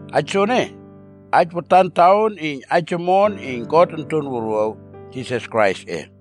Aij soene, aij watan taon iyn aij omon iyn God Onton Wuruaw, Jisas Kraisꞌe.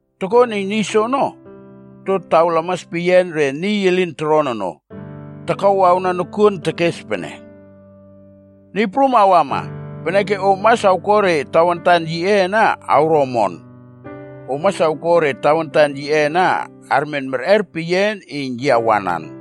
Tokon iyn niy soono, okto taw lamas peyian re niy elin toron ono, takawawna nokuon tekes pene, ‘Niy Prum awama, peneke om mas awko re tawantan yiꞌe ana awro omon. Om mas awko re tawantan yiꞌe ana armen merꞌer peyian iyn yi awanan.a’”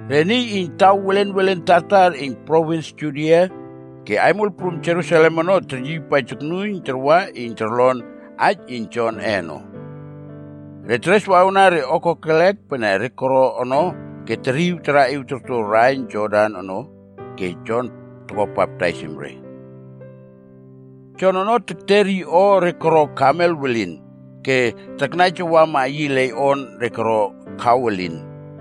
Re niy iyn taw welen welen tartar iyn provins Judia ke aimol prum Jerusalem ono teryiypaij toknuiyn tarwa iyn torlon aij iyn Jonꞌe ono. Re tereswawna re o kokelek pene re koro ono ke teriw taraꞌiw torto raiyn Jordan ono ke Jon toko baptaisim re. Jon ono tekter yi o re koro kamel welin,b ke taknaijawama yi leiꞌon re koro kaw elin.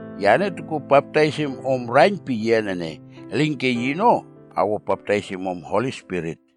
Yane tokuo baptaisim om raiyn peyian ene, elinke yino awo baptaisim om Holi Spirit.”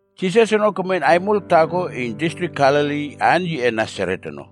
Jisas ono kemen aimol taako iyn distrik Galili aan yiꞌe Nasaret ono.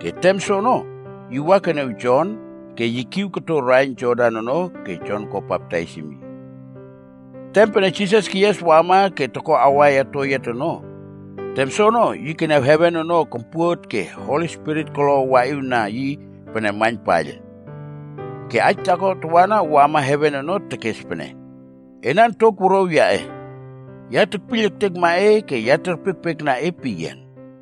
Ke tem soono, yi wa keniaw Jon ke yi kiw koto raiyn Jordan ono ke Jon ko baptaisim yi. Tem pene Jisas keyias wama ke toko awaiya toyiat ono, tem soono yi keniaw heven ono kompuot ke Holi Spirit kolo waꞌiwna yi pene maiyn paiyl. Ke aij taako tawana wama heven ono tekes pene, “Ena ontok wuruaw yaꞌe. Ya tekpiyl ektekma e ke ya terpiekpiekna e peyian.”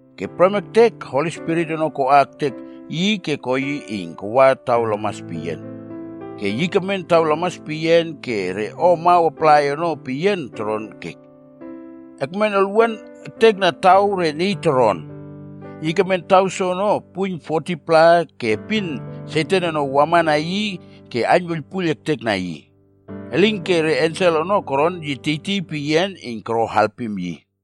Ke prem ektek Holi Spirit ono koa ektek yi ke ko yi iyn kawa taw lamas peyian. Ke yi kemen taw lamas peyian ke re o amaw aplai ono peyian toron ke ekmen olwuan ektekna taw re niy toron. Yi kemen taw soono puiyn 40-pla ke epin Satan ono wamana yi ke aiynwuiylpuiyl ektekna yi. Elinke re ensel ono koron yi tiytiy peyian iyn koro alpim yi.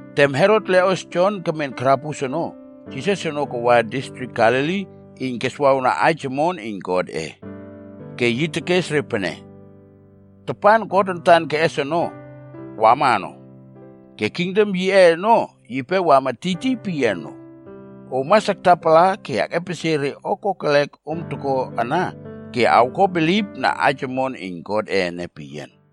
Tem Herot leꞌos Jon kemen karabus ono, ke Jisas ono kawa distrik Galili iyn keswawna aij omon iyn Godꞌe. Ke yi tekes re pene, “Tapan God antan keꞌes ono, wama ono. Ke kingdom yiꞌe ono yipe wama tiytiy peyian no. Om mas aktapala ke ekꞌepesie re o kokelek om toko ana ke awko bilipna aij omon iyn Godꞌe ene peyian.”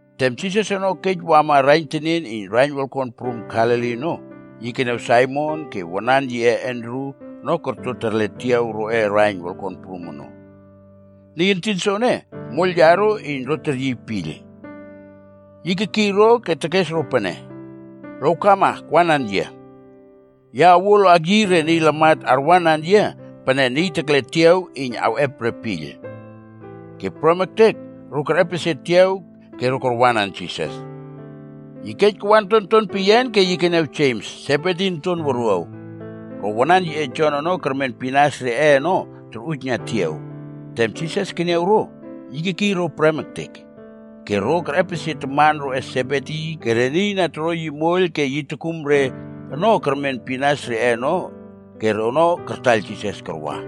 Tem Jisas ono kej wama raiyn tenien iyn raiyn wolkon prum Galili ono, yi keniaw Saimon ke wanan yiꞌe Andru ono korto terle tiaw roꞌe raiyn wolkon prum ono. Niy entin soene, moiyl yaro iyn ro teryiy piyl. Yi kekiy ro ke tekes ro pene, “Lowkama akwanan yia. Ya awuo lo akyiy re niy lamat arwanan yia pene niy tekle tiaw iyn awꞌep re piyl.” Ke prem ektek, ro kerꞌepesie tiaw ke ro karwanan Jisas. Yi kej kawa ontonton peyian ke yi keniaw Jems, Sebedi onton wuruaw, ro wanan yiꞌe Jon ono kermen pinas reꞌe ono torꞌujna tiaw. Tem Jisas keniaw ro, yi kekiy ro prem ektek. Ke ro kerꞌepesie taman roꞌe Sebedi ke re niy na toro yi moiyl ke yi tokum re ono kermen pinas reꞌe ono ke rono kartaiyl Jisas karwa.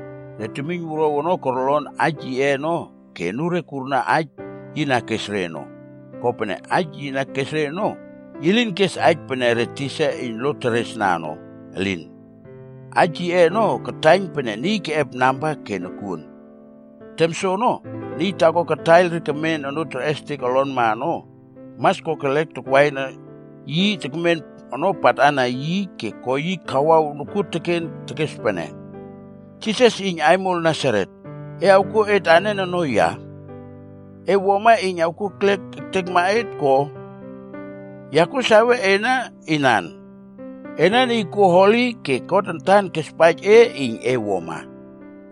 Re temiynwuruaw ono korlon aij yiꞌe ono ke anure kurna aij yi na kes re ono. Kopene aij yi na kes re ono, yi lin kes aij pene re tisa iyn lo teresresna ono, elin. Aij yiꞌe ono kataiyn pene niy keꞌep namba ke nokuon. Tem soono, niy taako kataiyl re kemen onoo terꞌestek olonma ono, mas kokelek takwaina yi tekmen ono patana yi ke ko yi kawaw nokuon ke tekes pene, “Jisas iyn aimol Nasaret, e awkuo et anen ono ya? E wuama iyn awkuo ekliek ektekma et ko? Ya kuo sawe ena inan. Ena Niy kuo Holi ke God antan kespaij e iyn e wuama.”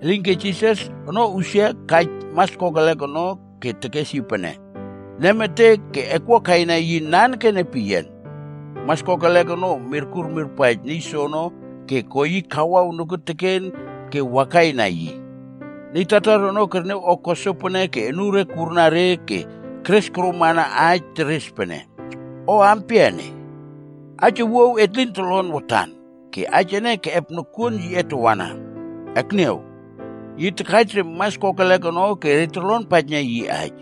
Elinke Jisas ono usia ke kaij mas kokelek ono ke tekes yi pene, “Nemetek ke ekwua kaina yi nanekene peyian.” Mas kokelek ono, mirkur mirpaij niy soono ke ko yi kawaw nokuoteken ke wakaina yi. Niy tartar ono kerniaw o ko sopene ke anure kurna re ke keres koromana aij teres pene, “O ampia ene? Aij owuaw et lin tolon watan, ke aij ene keꞌep nokuon yiꞌe tawana. Akniaw, yi takaij re mas kokelek ono ke re torlonpaijna yi aij.”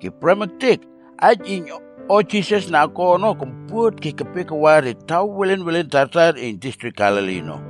Ke prem ektek, aij iyn o Jisas na ko ono kompuot ke kepe kawa re taw welen welen tartar iyn distrik Galili ono.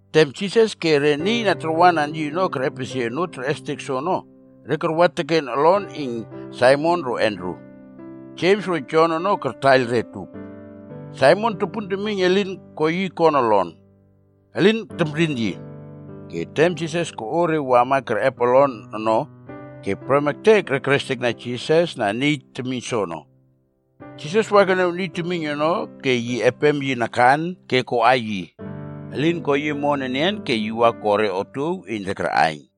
Tem Jisas ke re niy na tarwanan yi ono kerꞌepesie onoo terꞌestek soono, ke karwa teken olon iyn Saimon ro Andru. Jems ro Jon ono kartaiyl re utup. Saimon topun temiyn elin ko yi kon olon. Elin temrin yi. Ke tem Jisas koꞌo re wama kerꞌep olon ono, ke prem ektek re kerestekna Jisas na niy temiyn soono. Jisas wa keniaw niy temiyn ono ke yi epem yi nakan ke koꞌa yi. Elin ko yi omon enian ke yi wa ko re otuow iyn re arꞌaiyn.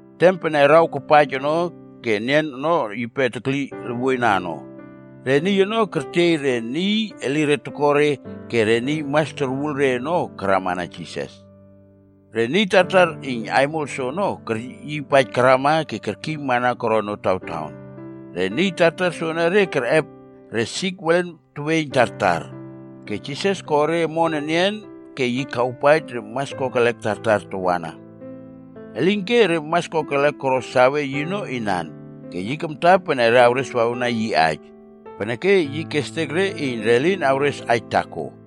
Tem pene araw kapaij ono ke nien ono yipe tekli luwuoina ono, re niy ono kertiey re niy elire toko re ke re niy mas torwul re ono karamana Jisas. Re niy tartar iyn aimol soono keryiypaij karama ke kerkiymana koron notawtaon. Re niy tartar soenere kerꞌep re sik welen teweiyn tartar, ke Jisas ko re koro omon enian ke yi kawpaij re mas kokelek tartar tawana. Elinke, re mas kokelek koro sawe yino inan, ke yi kamta pene re awreswawna yi aij, peneke yi kestek re iyn re lin awres aij taako.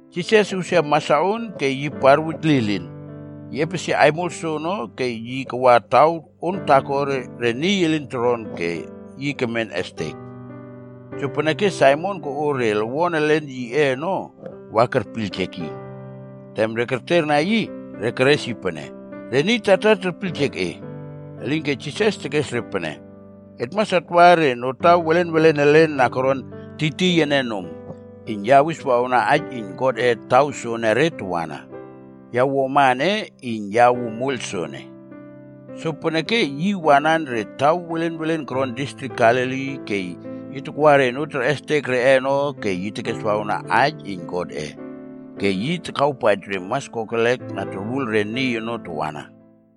Jisas usia masaon ke yi parwuj lilin. Yi epesie aimol soono ke yi kawa taw on taako re niy elin toron ke yi kemen estek. Jopeneke Saimon koꞌo re lowon elen yiꞌe ono wa kerpiyljek yi. Tem re kerterna yi, re keres yi pene, “Re niy tartar terpiyljek e.” Elinke Jisas tekes re pene, “Et mas atwa re notaw welenwelen elen na koron tiytiy ene nom, iyn ya awiswawna aij iyn Godꞌe taw soonore tawana. Ya wuama ene iyn ya awuo moiyl soene.” Sopeneke yi wanan re taw welen welen koron distrik Galili ke yi takwa re onoo terꞌestek reꞌe ono ke yi tekeswawna aij iyn Godꞌe. Ke yi takawpaij re mas kokelek na torwul re niy ono tawana.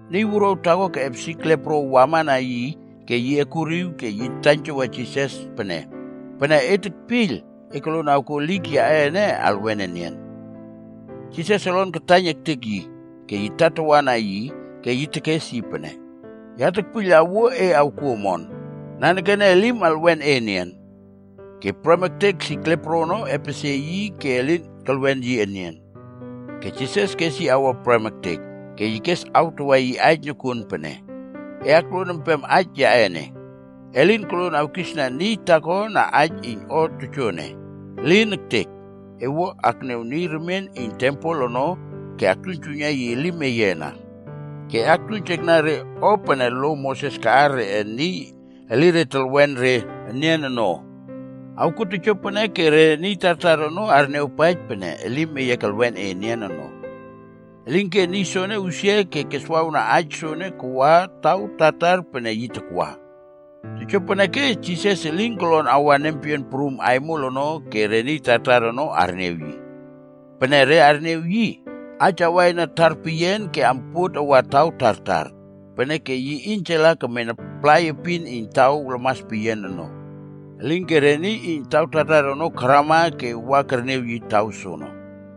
Niy wuruaw taako keꞌep sik lepro wama na yi ke ekuriw ke yi taiynjawa Jisas pene, “Pene e tekpiyl, e koluon awkuo elik yaꞌe ene alwen enian.” Jisas olon kataiyn ektek yi, ke yi tatawana yi, ke yi tekes yi pene, “Ya tekpiyl awuo e awkuo omon. Nanekene elim alwen e enian.” Ke, prem ektek sik lepro ono epesie yi ke elin kelwen yi enian. Ke Jisas kes yi awa prem ektek, ke yi kes awtawa yi aij nokuon pene, “E akluon empem aij yaꞌe ene. E lin koluon awkisna niy taako na aij iyn o tojoene. Elin ektek! E wua ekniaw niy remien iyn tempel ono ke aktuiynjuiyna yi elim eye ana. Ke e aktuiynjekna re o pene lo Moses kaꞌar reꞌe niy elire telwen re enian ono. Awkuo tojopene ke re niy tartar ono arniawpaij pene elim eye kelwen e enian ono.” Elinke niy soene usia ke keswawna aij soene kawa taw tartar pene yi takwa. Jopeneke Jisas elin kolon awa nempeyian prum aimol ono ke re niy tartar ono arniaw yi. Pene re arniaw yi, aij awaina tarpeyian ke ampuot awa taw tartar. Peneke yi iynjala kemen aplai epin iyn taw lamas peyian ono. Elinke re niy iyn taw tartar ono karama ke wa kerniaw yi taw soono.